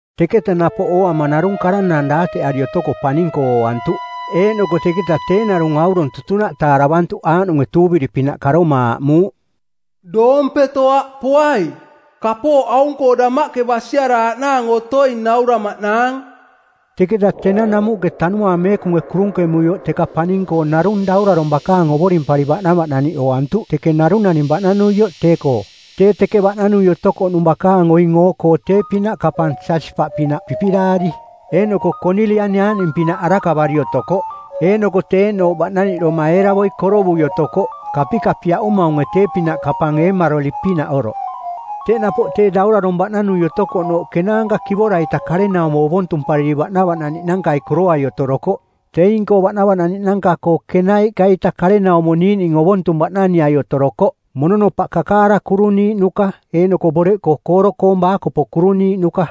Teketa napoꞌ ooama narung karanaang daateꞌari otoko paning-koo ooantuꞌ, eeꞌnoko teketa tee narung aurong tutunaꞌ taaravantuꞌ aaꞌnunge tuuviri-pinaꞌ karoma aaꞌmuuꞌ, “Doompeto aꞌ poai. Kapooꞌ aung-koo damaꞌke basiaraaꞌnaang otoing nauramaꞌnaang.” Teketa tenang namuꞌke Tanuaang Meekunge kurunkemuioꞌ teka paning-koo narung Daurarong bakaang ovorimpari baꞌnavaꞌnaniꞌ ooantuꞌ teke narung naning baꞌnanuioꞌ tee-koo. Tee teke baꞌnanui otokoꞌnung bakaang oing oo-koo tee-pinaꞌ kapang jasipaꞌpinaꞌ pipiꞌdaari, eeꞌnoko konilian aaꞌning-pinaꞌ arakavari otokoꞌ, eeꞌnoko teꞌ eeꞌnooꞌ baꞌnaniꞌdoma eeravoi korovui otokoꞌ, kapikapiaꞌumaunge tee-pinaꞌ kapang eemaroli-pinaꞌ oroꞌ. Teꞌ napoꞌ tee daurarong baꞌnanui otokoꞌnooꞌ kenaanka kivora-ita karenaumo ovontumpariri baꞌnavaꞌnaniꞌnankai koroai otorokoꞌ. Teing-koo baꞌnavaꞌnaniꞌnanka-koo kenaiꞌka-ita karenaumo niiꞌning ovontung baꞌnaniai otorokoꞌ, mononopaꞌ kakaara kuruniiꞌnuka eeꞌnoko boreꞌkoo kooro-koong baakopo kuruniiꞌnuka.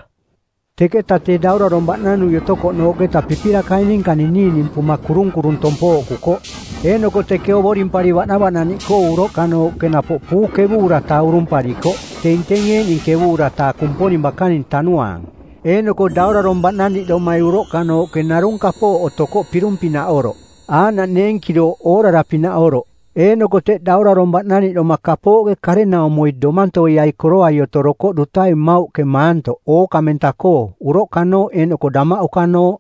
Teketa tee daurarong baꞌnanui otokoꞌnooꞌketa pipirakai ninka ninininimpuma kurung-kurung tompooꞌkukoꞌ. Eeꞌnoko teke ovorimpari baꞌnavaꞌnaniꞌkoo uroꞌkanooꞌke napoꞌ puu ˜kevuura-taa urumparikoꞌ, teing teing eeꞌning ˜kevuura-taa Kumponing bakaning Tanuaang. Eeꞌnoko Daurarong baꞌnaniꞌdomai uroꞌkanooꞌke narung kapooꞌ otokoꞌ pirung-pinaꞌ oroꞌ, aaꞌnaꞌ neenkirooꞌ oorara pinaꞌ oroꞌ. Eeꞌnoko teꞌ Daurarong baꞌnaniꞌdoma kapooꞌke karenaumoi domantoiai koroai otorokoꞌ dutai mmauꞌke maantoꞌ ookamenta-koo, uroꞌkanooꞌ eeꞌnoko damaꞌukanooꞌ.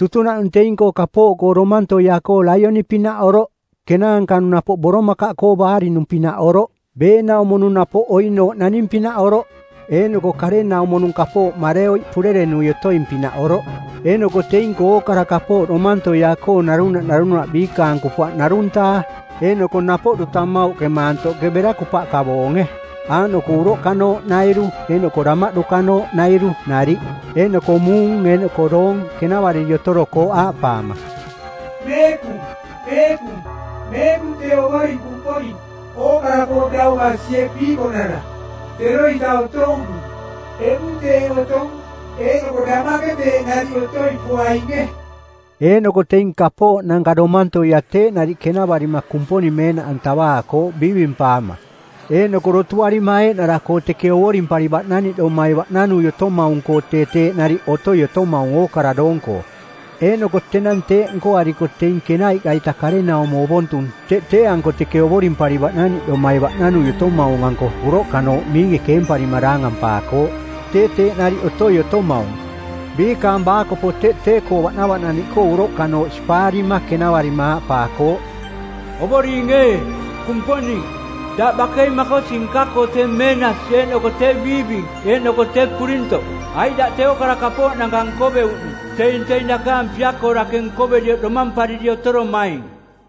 Tutunaꞌnung teing-koo kapooꞌkoo domantoia-koo laioni-pinaꞌ oroꞌ. Kenaanka-nung napoꞌ boromakaꞌkoo baarinung-pinaꞌ oroꞌ. Beenaumo-nung napoꞌ oinooꞌ naning-pinaꞌ oroꞌ, eeꞌnoko karenaumo-nung kapooꞌ mareoiꞌ purerenui otoing-pinaꞌ oroꞌ. Eeꞌnoko teing-koo ookara kapooꞌ domantoia-koo narunaꞌ narunaꞌ biikaang kupaꞌ ˜narung-taa. Eeꞌnoko napoꞌ duta mmauꞌke maantoꞌke bera kupaꞌka boonge, aaꞌnoko uroꞌkanooꞌnairu eeꞌnoko damaꞌdukanooꞌnairu nariꞌ. Eeꞌnoko muung eeꞌnoko doong kenavariri otorokooꞌ aaꞌpaama, “Meekung, meekung, meekung tee Ovoring Kumponing, ookara-koo dau basie piikonara. Teroita otouꞌnung, eꞌmung teeꞌ otong, eeꞌnoko damaꞌke teeꞌ nariꞌ otoi poainge.” Eeꞌnoko teing kapooꞌnanka domantoia teeꞌ nariꞌ kenavarima Kumponing meenaꞌantavaakooꞌ biivimpaama eeꞌnoko dotuarima eeꞌnara-koo teke ovorimpari baꞌnaniꞌdomai baꞌnanui otomaung-koo tee teeꞌ nariꞌ otoi otomaung ookara doong-koo. Eeꞌnoko tenang teeꞌ nkoariko teing kenaiꞌka-ita karenaumo ovontung teꞌ tee-anko teke ovorimpari baꞌnaniꞌdomai baꞌnanui otomaung-anko uroꞌkanooꞌ miinge keemparima daangampaakooꞌ, tee teeꞌ nariꞌ otoi otomaung. Biikaang baakopo teꞌ tee-koo baꞌnavaꞌnaniꞌkoo uroꞌkanooꞌ sipaarima kenavarima aaꞌpaakooꞌ, “Ovoring ee, Kumponing, daꞌ bakei makosi nka-koo tee meenasi eeꞌnoko tee biiving eeꞌnoko tee purintoꞌ, aiꞌ daꞌ tee ookara kapooꞌnanka nkoveuꞌnung. Teing teing dakaang pia-koo dake nkoverioꞌ domampariri otoromaing.”